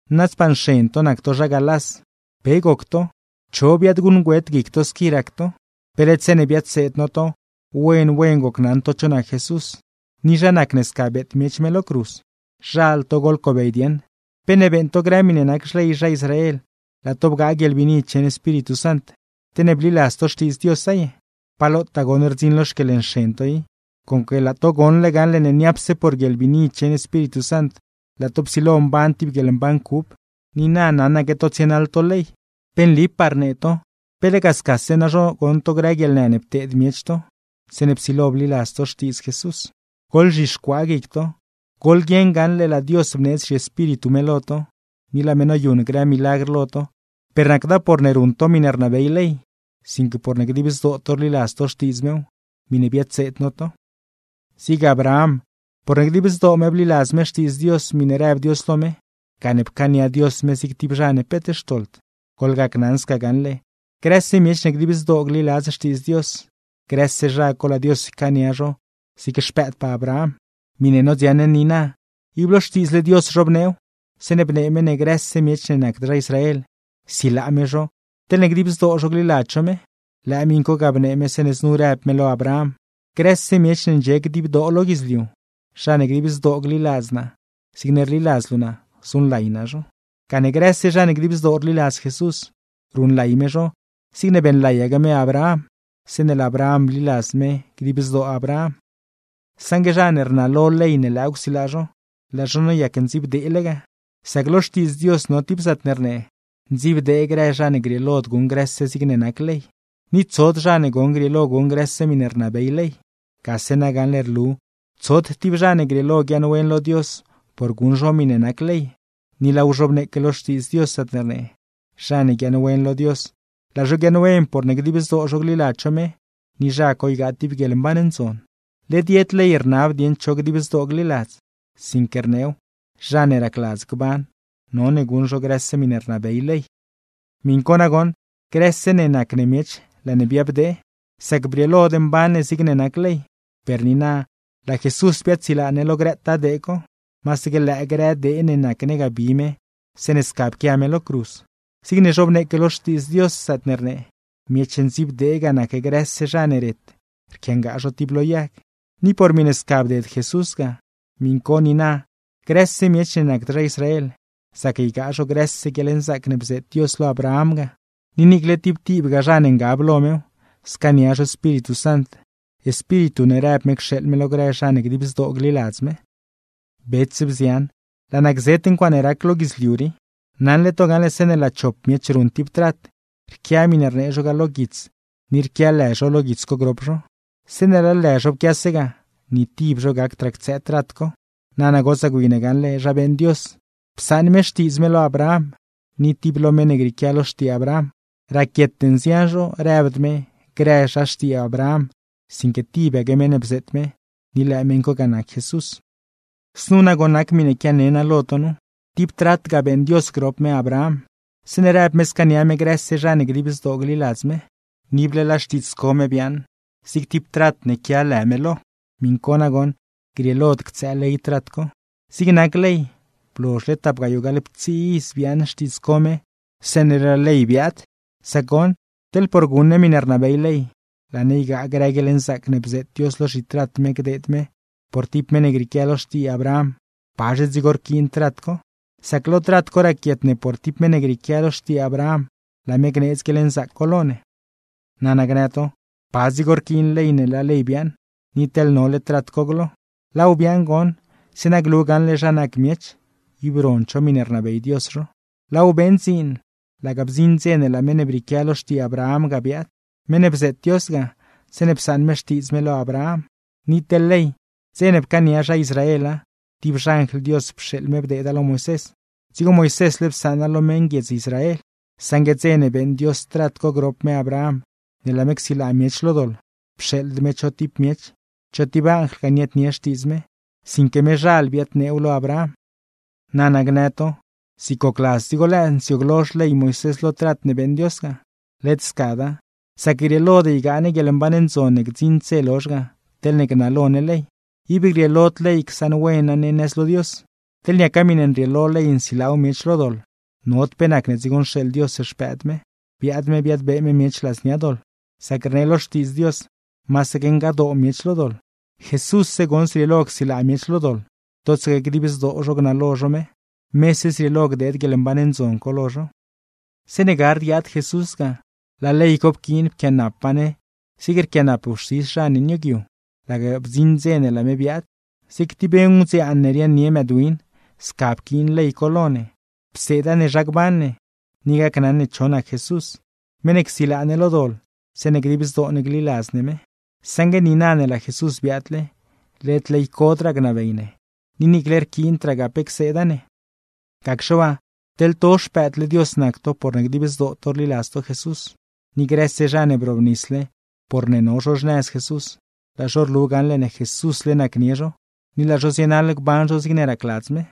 ¡Nadzpaa nxen to nac to zha Galás! ¿Pe goc to, cho biaadguṉgüet guic to squi rac to? Pe led zeeṉe biadseed no to, wen wen gocnaṉ to cho nac Jesús, ni zha nacne sca beet miech me lo cruz. Zhal to goḻcobey dieṉ, ¿pe ne beeṉ to grë miṉe nac xley zha Israel, laa to bgaa guieḻbiini cheṉ Espíritu Sant, te ne bliladz to Xtiidz Diosa ye? Pa lotaa goṉ rdziṉ lo xquieḻnxen to i, conque laa to goṉle gaṉle ne niapse por guieḻbiini cheṉ Espíritu Sant laa to psilo mban tib guieḻmban cub, ni na naṉaque to tsienaḻ to ley. Pe nlipaa rnee to, ¿pe lega scase nazho goṉ to grë guieḻnë ne pteed miech to, zeeṉe psilo bliladz to Xtiidz Jesús? ¡Goḻzhixcuaa guic to! Goḻguieṉ gaṉle, laa Dios bneedz zhiEspíritu me lo to, ni laa me noyuṉ grë milagr lo to, per nacda porne ruṉ to miṉe rnabey ley, sinque porne dib zdoo to rliladz to Xtiidz mew, miṉe biadseed no to. Zig Abraham, porne dib zdoo me bliladz me xtiidz Dios miṉe rëb Dios lo me, gane pcaania Dios me zig tib zha ne peet xtoḻd. Goḻgacnaṉ sca gaṉle, grëse miech ne dib zdoo gliladz Xtiidz Dios, grëse zha co laa Dios ycaania zho zig xpëëdpaa Abraham. Ni miṉe nodziaṉ ne niina, ib lo Xtiidzle Dios zhobneew, zeeṉe bnee me ne grëse miech ne nacd zha Israel, silaa me zho teḻne dib zdoo zho gliladz zho me. Lëë miṉ co ga bnee me zeeṉe znu rëb me lo Abraham: “Grëse miech ne ndxie dibdoo lo guidzliu, zha ne dib zdoo gliladz naa zigne rliladz luu naa, zuṉlay naa zho.” Gane grëse zha ne dib zdoo rliladz Jesús, ruṉlay me zho zigne beeṉlayaque me Abraham, zeeṉe laa Abraham bliladz me dib zdoo Abraham. Saṉgue zha ne rnalo ley ne lëëw csilaa zho, laa zho noyac ndziibdeele ga, sac lo Xtiidz Dios no tib zaatne rnee: “Ndziibdee grë zha ne grieelod guṉ grëse zigne nac ley.” ¡Ni tsod zha ne goṉ grieelo guṉ grëse miṉe rnabey ley! Gase nagaṉle rlu tsod tib zha ne grieelo guiaaṉwen lo Dios por guṉ zho miṉe nac ley; ni laaw zhobneeque lo Xtiidz Dios zaatne rnee: “Zha ne guiaaṉwen lo Dios, laa zho guiaaṉwen porne dib zdoo zho gliladz zho me; ni zha co ygaa tib guieḻmban ndzon.” Led yed ley rnab dieṉ cho dib zdoo gliladz; sinque rneew: “Zha ne racladz gban, none guṉ zho grëse miṉe rnabey ley.” Miṉ co nagoṉ, grëse ne nac ne miech laa ne biabdee, sac brieelod mban ne zigne nac ley. Per niina, laa Jesús biaadsilaa ne lo grëtaa dee co, masaque lëë grë dee ne nac ne ga bi me zeeṉe sca pquia me lo cruz; zigne zhobneeque lo Xtiidz Dios, zaatne rnee: “Miech ndziibdee ga nac grëse zha ne ret rquiangaa zho tib lo yag.” Ni por miṉe sca bded Jesús ga, miṉ co niina grëse miech ne nacd zha Israel, zac ygaa zho grëse guieḻnzaac ne bzeet Dios lo Abraham ga; ni niicle tib tibgaa zha ne ngab lo mew, scaania zho Espíritu Sant, Espíritu ne rëb me cxeeḻ me lo grë zha ne dib zdoo gliladz me. Bets, bzian, laa naa gzet ncuaaṉe rac lo guidzliu rii. Naṉle to gaṉle, zeeṉe laa chop miech ruṉ tib trat, rquia miṉe rnee zho ga lo guits ni rquia lë zho lo guits co grop zho; zeeṉe laa lë zho pquiase ga, ni tib zho gacdraa ctsëë trat co. Nana gotsaa gwi ne gaṉle zha beeṉ Dios: Psaṉ me xtiidz me lo Abraham, ni tib lo meṉ ne grieequia lo xtii Abraham. Raquiete nzian zho, rëbd me: “grë zha xtii Abraham”, sinque tibaque meṉ ne bzeet me, ni lëë meṉ co ga nac Jesús. Znu nagoṉ nac miṉe quiane naa lo to nu: Tib trat ga beeṉ Dios grop me Abraham, zeeṉe rëb me scaania me grëse zha ne dib zdoo gliladz me; ni ible laa xtiidz co me biaaṉ zig tib trat ne quia lë me lo. Miṉ co nagoṉ, grieelod ctsëë ley trat co; zig nac ley, blozhle tap gayoo gaḻptsii iz biaaṉ xtiidz co me zeeṉe laa ley biaad. Nana, teḻne por guṉ ne miṉe rnabey ley, laa ne ygaa grë guieḻnzaac ne bzeet Dios lo zhitrat me gdeed me por tib meṉ ne grieequia lo xtii Abraham; ¿pazhe dzigo rquiin trat co? Sac lo trat co goṉ raquiet ne por tib meṉ ne grieequia lo xtii Abraham, laa me gneedz guieḻnzaac co lo ne. Nana gnë to: “¿Pa dzigo rquiin ley ne laa ley biaaṉ, ni teḻ nole trat co glo?” Laaw biaaṉ goṉ zeeṉa glu gaṉle zha nac miech, ib rond zho miṉe rnabey Dios zho, laaw beeṉ dziin laga bdziṉ dze ne laa meṉ ne brieequia lo xtii Abraham ga biaad, meṉ ne bzeet Dios ga zeeṉe psaṉ me xtiidz me lo Abraham. Ni teḻ ley, dze ne pcaania zha Israela tib xanjl Dios pxeeḻ me bdeeda lo Moisés, dzigo Moisésle psaṉa lo meṉguiedz Israel. Saṉgue dze ne beeṉ Dios trat co grop me Abraham ne laa me csilaa miech lo doḻ, pxeeḻd me cho tib miech, cho tib anjlgaa niaadnie xtiidz me; sinque mezhal biadneew lo Abraham. Nana gnë to: “¿Zig gocladz dzigo lëë nsiooglo xley Moisés lo trat ne beeṉ Dios ga?” ¡Led scada! Sac grieelod ygaa ne guieḻmban ndzon ne gdziṉd dze lozh ga, teḻne gnalo ne ley; ib grieelod ley csaṉwena ne nëz lo Dios. Teḻne niaca miṉe nrieelo ley nsilaaw miech lo doḻ, nod pe nacne dzigo nxeeḻ Dios Xpëëd me, biaad me biadbee me miech ladznia doḻ (sac rnee lo Xtiidz Dios masaque ngadoo miech lo doḻ). Jesússe goṉ zrieelo csilaa miech lo doḻ, totsaque dib zdoo zho gnalo zho me, mese zrieelo gdeed guieḻmban ndzon co lo zho. Zeeṉe gard guiaad Jesús ga, laa ley co pquiin pquianapa ne zigne rquianap wxtis zha ne nioogyu, laga bdziṉ dze ne laa me biaad. Zig tib ngudziaan ne riaaṉnie mëëdwin, sca pquiin ley co lo ne, pseeda ne zha gban ne, ni gacnaṉ ne cho nac Jesús, meṉ ne csilaa ne lo doḻ zeeṉe dib zdoo ne gliladz ne me. Saṉgue niina ne laa Jesús biaadle, led ley codraa gnabey ne, ni niicle rquiindragaa pe cseeda ne. Gacxe waa, teḻ to xpëëdle Dios nac to porne dib zdoo to rliladz to Jesús, ni grëse zha ne brobnisle porne no zho xnëz Jesús, laa zho rlu gaṉle ne Jesúsle nacnie zho, ni laa zho zienaḻ gban zho zig racladz me.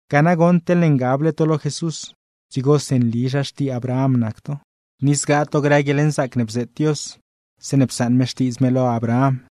Ga nagoṉ, teḻne ngable to lo Jesús, dzigosi nli zha xtii Abraham nac to, ni zgaa to grë guieḻnzaac ne bzeet Dios zeeṉe psaṉ me xtiidz me lo Abraham.